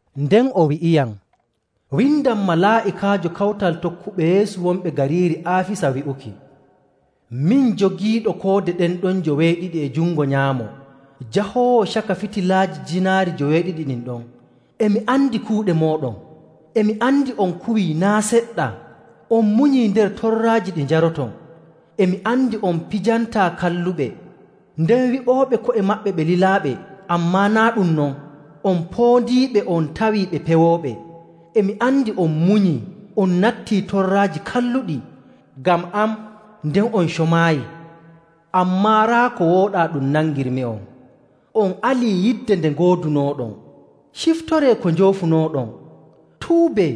Nden o wi'iyam, “Windan malaa'ikaajo kawtal tokkuɓe Yeesu wonɓe gariiri Aafisa wi'uki: “Min jogiiɗo koode ɗen ɗon joweeɗiɗi e jungo nyaamo, jahoowo caka fitilaaji jiinaari joweeɗiɗi ɗin ɗon. E mi andi kuuɗe mooɗon. E mi andi on kuwii naa' seɗɗa, on munyii nder torraaji ɗi njaroton. E mi andi on pijantaa kalluɓe. Nden wi'ooɓe ko'e maɓɓe ɓe lilaaɓe, ammaa naa' ɗum non on poondiiɓe on tawii ɓe pewooɓe. E mi andi on munyii, on natti torraaji kalluɗi ngam am nden on comaayi. Ammaa raa ko wooɗaa ɗum nangirmi'on: on alii yidde nde ngoodunooɗon. Ciptoree ko njoofunooɗon, tuubee,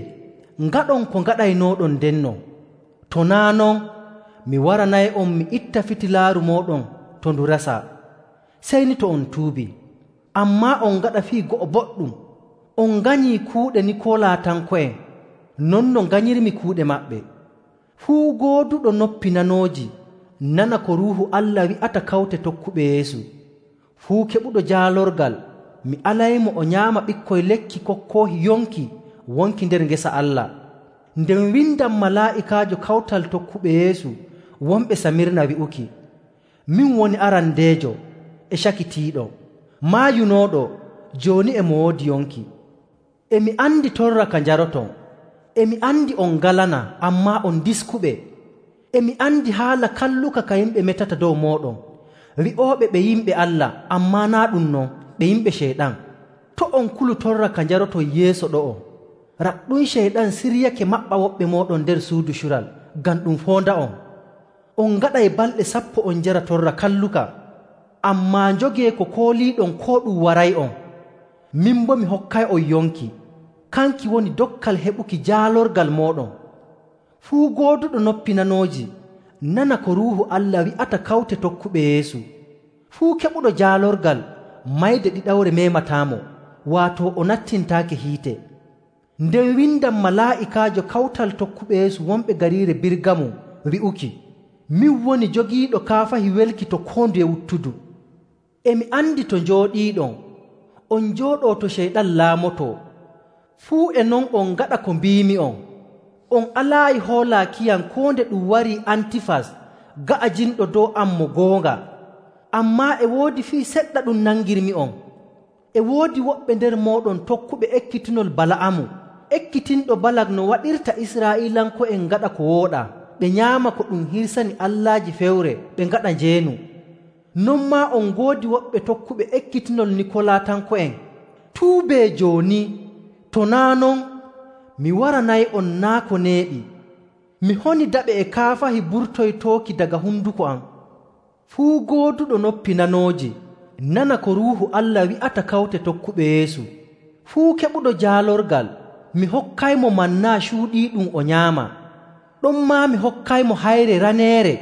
ngaɗon ko ngaɗaynooɗon ndenno. To naa' non, mi waranay'on mi itta fitilaaru mooɗon to ndu resaa, sey ni to on tuubii. Ammaa on ngaɗa fii go'o boɗɗum. On nganyii kuuɗe Nikoolatanko'en, non no nganyirmi kuuɗe maɓɓe. “Fuu gooduɗo noppi nanooji nana ko Ruuhu Allah wi'ata kawte tokkuɓe Yeesu. “Fuu keɓuɗo jaalorgal mi alaymo o nyaama ɓikkoy lekki kokkoohi yonki wonki nder ngesa Allah. “Nden windan malaa'ikaajo kawtal tokkuɓe Yeesu wonɓe Samirna wi'uki: “Min woni arandeejo e cakitiiɗo, maayunooɗo jooni e mo woodi yonki. E mi andi torra ka njaroton, e mi andi on ngalanaa, ammaa on diskuɓe. E mi andi haala kalluka ka yimɓe metata dow mooɗon, wi'ooɓe ɓe yimɓe Allah, ammaa naa' ɗum non, ɓe yimɓe Ceyɗan. To' on kulu torra ka njaroton yeeso ɗo'o. Raɗɗum Ceyɗan siryake maɓɓa woɓɓe mooɗon nder suudu cural ngam ɗum foonda'on. On ngaɗay balɗe sappo on njara torra kalluka. Ammaa njogee ko kooliiɗon koo ɗum waray'on. Min boo mi hokkay'on yonki, kanki woni dokkal heɓuki jaalorgal mooɗon. “Fuu gooduɗo noppi nanooji nana ko Ruuhu Allah wi'ata kawte tokkuɓe Yeesu. “Fuu keɓuɗo jaalorgal, mayde ɗiɗawre meemataamo, waato o nattintaake hiite. “Nden windan malaa'ikaajo kawtal tokkuɓe Yeesu wonɓe gariiri Birgamum wi'uki: “Min woni jogiiɗo kaafahi welki to koo nduye wuttudu. E mi andi to njooɗiiɗon; on njooɗoo to Ceyɗan laamotoo. Fuu e non, on ngaɗa ko mbiimi'on, on alaayi hoolaakiyam koo nde ɗum wari Antifas ga'ajinɗo dow am mo goonga. Ammaa e woodi fii seɗɗa ɗum nangirmi'on. E woodi woɓɓe nder mooɗon tokkuɓe ekkitinol Bala'amu, ekkitinɗo Balak no waɗirta Israa'iilanko'en ngaɗa ko wooɗaa, ɓe nyaama ko ɗum hirsani allaaji fewre ɓe ngaɗa njeenu. Non maa on ngoodi woɓɓe tokkuɓe ekkitinol Nikoolatanko'en. Tuubee jooni! To naa' non, mi waranay'on naa' ko neeɓi, mi honidaɓe e kaafahi burtoytooki daga honduko am. “Fuu gooduɗo noppi nanooji nana ko Ruuhu Allah wi'ata kawte tokkuɓe Yeesu. “Fuu keɓuɗo jaalorgal, mi hokkaymo manna cuuɗiiɗum o nyaama. Ɗonmaa mi hokkaymo hayre raneere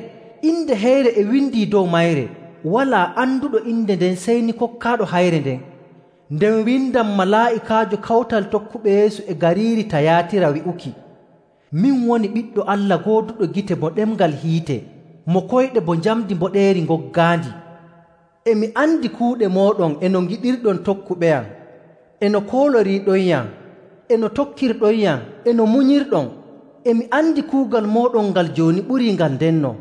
inde heyre e windii dow mayre. Walaa anduɗo inde nden sey ni kokkaaɗo hayre nden. “Nden windan malaa'ikaajo kawtal tokkuɓe Yeesu e gariiri Tayaatira wi'uki: “Min woni Ɓiɗɗo Allah gooduɗo gite bo ɗemngal hiite, mo koyɗe bo njamndi mboɗeeri ngoggaandi. E mi andi kuuɗe mooɗon e no ngiɗirɗon tokkuɓeyam e no kooloriiɗonyam e no tokkirɗonyam e no munyirɗon. E mi andi kuugal mooɗon ngal jooni ɓurii ngal ndenno.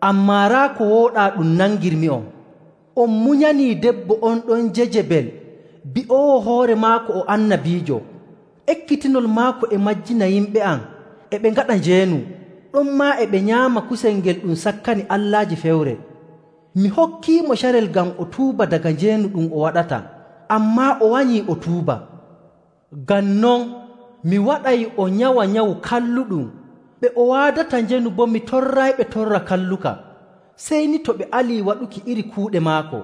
Ammaa raa ko wooɗaa ɗum nangirmi'on. On munyanii debbo on ɗon Jejebel bi'oowo hoore maako o annabiijo. Ekkitinol maako e majjina yimɓe am e ɓe ngaɗa njeenu, ɗonmaa e ɓe nyaama kusel ngel ɗum sakkani allaaji fewre. Mi hokkiimo carel ngam o tuuba daga njeenu ɗum o waɗata, ammaa o wanyii o tuuba. Ngam non mi waɗay o nyawa nyawu kalluɗum. Ɓe o waadata njeenu boo mi torrayɓe torra kalluka, sey ni to ɓe alii waɗuki iri kuuɗe maako.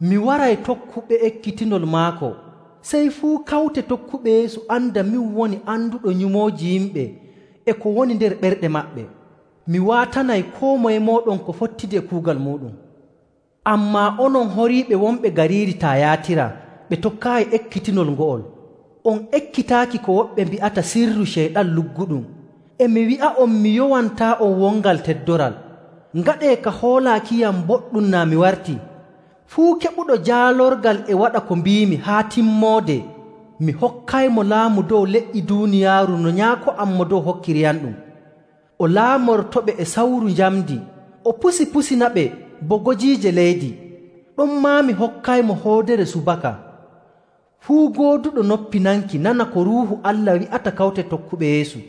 Mi waray tokkuɓe ekkitinol maako. Sey fuu kawte tokkuɓe Yeesu anda min woni anduɗo nyumooji yimɓe e ko woni nder ɓerɗe maɓɓe. Mi waatanay koo moye mooɗon ko fottidi e kuugal muuɗum. “Ammaa onon horiiɓe wonɓe gariiri Tayaatira ɓe tokkaayi ekkitinol ngo'ol, on ekkitaaki ko woɓɓe mbi'ata ‘Sirru Ceyɗan lugguɗum.’ E mi wi'a'on mi yowantaa'on wongal teddoral. Ngaɗee ka hoolaakiyam boɗɗum naa mi wartii. Fuu keɓuɗo jaalorgal e waɗa ko mbiimi haa timmoode, mi hokkaymo laamu dow leƴƴi duuniyaaru no Nyaako am Mo Dow hokkiriyamɗum. O laamortoɓe e sawru njamndi, o pusipusinaɓe bo gojiije leydi. Ɗonmaa mi hokkaymo hoodere subaka. “Fuu gooduɗo noppi nanki nana ko Ruuhu Allah wi'ata kawte tokkuɓe Yeesu.